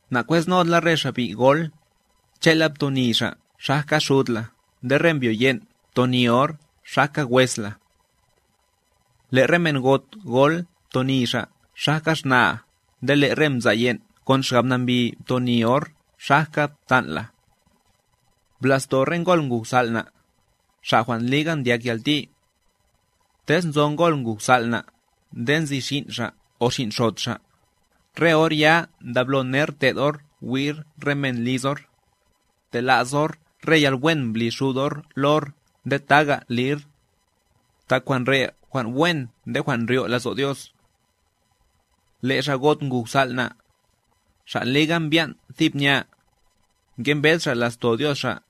Nakwesnod la re xa' bi' gol, che'la btoni xa' xajka xud la nde re mbyo yen' btoni or xajka wes la. Le' re men got gol btoni xa' xajka xna'a nde le' re mza' yen' kon xgab nambi btoni or xajka ptan' la. Bla'sto re ngol nguj sal' na', xa' jwan' liga ndyak yalti. Tez nzo ngol nguj sal' na' nde nzi xin' xa' o xin' xot xa', re or ya ndablo ner te'd or wi'r re men liz or, tela's or re yalwen mbli xud or lo or nde taga' lir, tak jwan' re' jwan' wen nde jwan' ndryo' lazo' Dios. Le' xa' got nguj sal' na', xa' liga mbyan' thib nya, ngembed xa' la'sto Dios xa',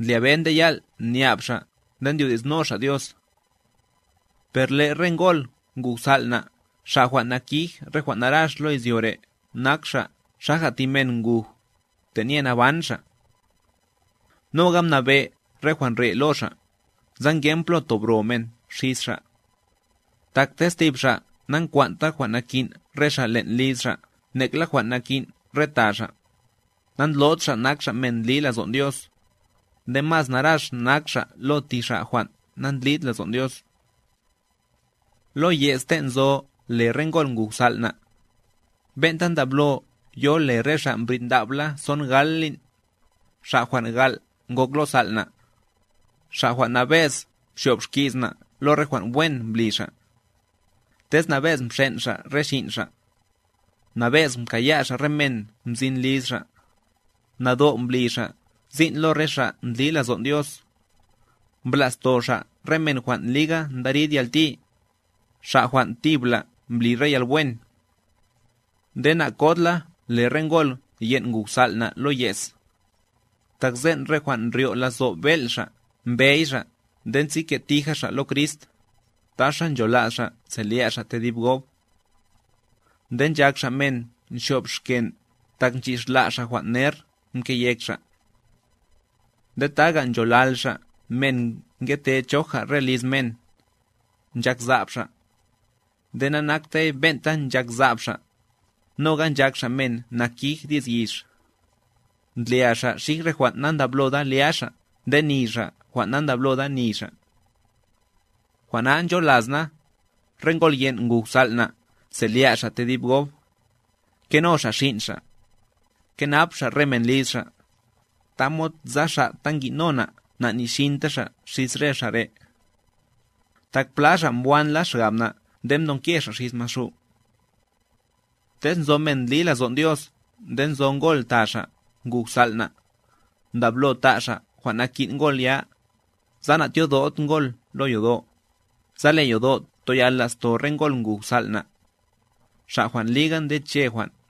ndlyabe nde yal' nyab' xa' nde ndyodi'sno xa' Dios. Per le' re ngol nguj sal' na' xa' jwan' nakij re jwan' narax lo izyo re' nak xa' xaja' thi men nguj, tenye naban xa'. Noga mnabe' re jwan' re' lo xa', sa ngen plo tob ro men xis xa'; tak tez thib xa' nankwan'ta jwan' nakin' re xa' len' liz xa' nekla jwan' nakin' re ta xa', nandlod xa' nak xa' men ndli lazon' Dios, nde mas narax nak xa' lo thi xa' jwan' nandlid lazon' Dios. Lo ye's ten' nzo le re ngol nguj sal' na', ben'ta ndablo yo le re xa' mbrid nda'b la son gal lin', xa' jwan' gal' ngok lo sal' na', xa' jwan' nabe'z nzo'b xki's na' lo re jwan' wen mbli xa'; tez nabe'z mxen' xa' re xin' xa', nabe'z mkaya' xa' re men mzin liz xa', nado' mbli xa' sin' lo re xa' ndli lazo'n Dios, mbla'sto xa' re men jwan' liga ndari'd yalti, xa' jwan' thibla' mbli re yalwen. Nde na'kod la le re ngol yen' nguj sal' na' lo ye's; tak sen' re jwan' ndryo' lazo' bel' xa' mbey xa' nde nzike' tija xa' lo Crist, taxa nchola's xa' selya' xa' tedib gob. Nde nchak xa' men nxyo'b xken' tak mchixla' xa' jwan' ner mke yek xa'. Nde taga' ncholal xa' men ngete choja re liz men, nchak sa'b xa', nde nanaktey ben'ta nchak sa'b xa', noga nchak xa' men nakij di's yix, ndlya xa' xij re jwan' nandabloda lya xa' nde ni xa' jwan' nandabloda ni xa'. Jwan' na ncholas na, re ngol yen' nguj sal' na' selya' xa' tedib gob, keno xa' xin' xa', kenap xa' re men liz xa', tamod sa xa' ta ngino na' na'nixinta xa' xis re xa' re'. Tak pla xa' mbwanla xgab na' nde mdonke xa' xis Maxu'. Tez nzo men ndli lazon' Dios nde nzo ngol ta xa' nguj sal' na', ndablo ta' xa' jwan' nakin' ngol ya, sa na'tyodod ngol lo yodo', sa le' yodo' toyal la'sto re ngol nguj sal' na', xa' jwan' liga ndeche jwan'.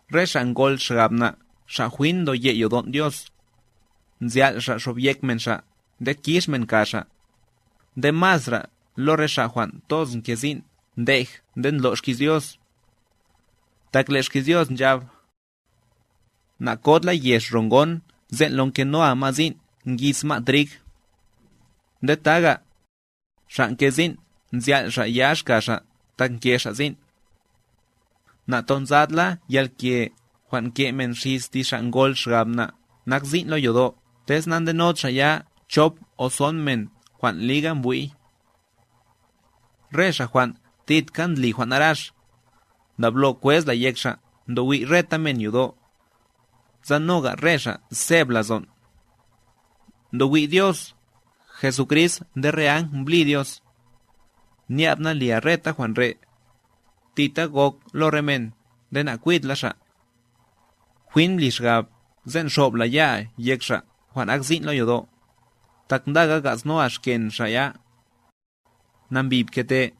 Re xa' ngol xgab na' xa' jwin ndoye' yodon' Dios, nzal' xa' xobyek men xa' nde kix men ka xa', nde masra lo re xa' jwan' toz nke sin' ndej nde ndlo' xki's Dios. Tak le' xki's Dios nchab: "Nakod la yex ro ngon sen' lo nkenoa ma' sin' ngis ma' trig." Nde taga': "Xa' nke sin' nzal' xa' yax ka xa' tak nke xa' sin'." Natonzad la yalke jwan' nke men xis thi xa' ngol xgab na' nak sin' lo yodo' tez nandenod xa' ya chop o son men jwan' liga mbwi'y. Re xa' jwan' thidka ndli jwan' narax, ndablo kwez la yek xa' ndowi' reta men yodo', sa noga' re xa' seb lazon'. Ndowi' Dios, Jesucrist nde re ang mblí Dios, nya'b na lia reta jwan' re', thita gok lo re men nde nakwid la xa'. Jwin bli xgab sen' xo'b la ya'a yek xa' jwan' ak sin' lo yodo', tak ndaga ga'snoa xken xa' ya. Nambi pkete.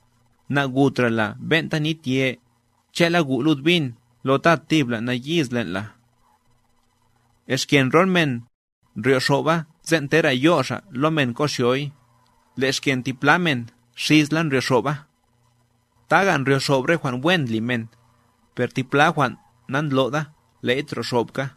Na'gutra la ben'ta nitye, che'la gu' lud bin lo ta thibla nayiz len' la. Xken rol men, ndryo'xo'ba sen' tera' yo' xa' lo men ko'xyoy, le' xken ti pla men xisla ndryo'xo'ba. Taga' ndryo'xo'b re jwan' wen ndli men; per ti pla jwan' nandlo'da le'y troxo'bka.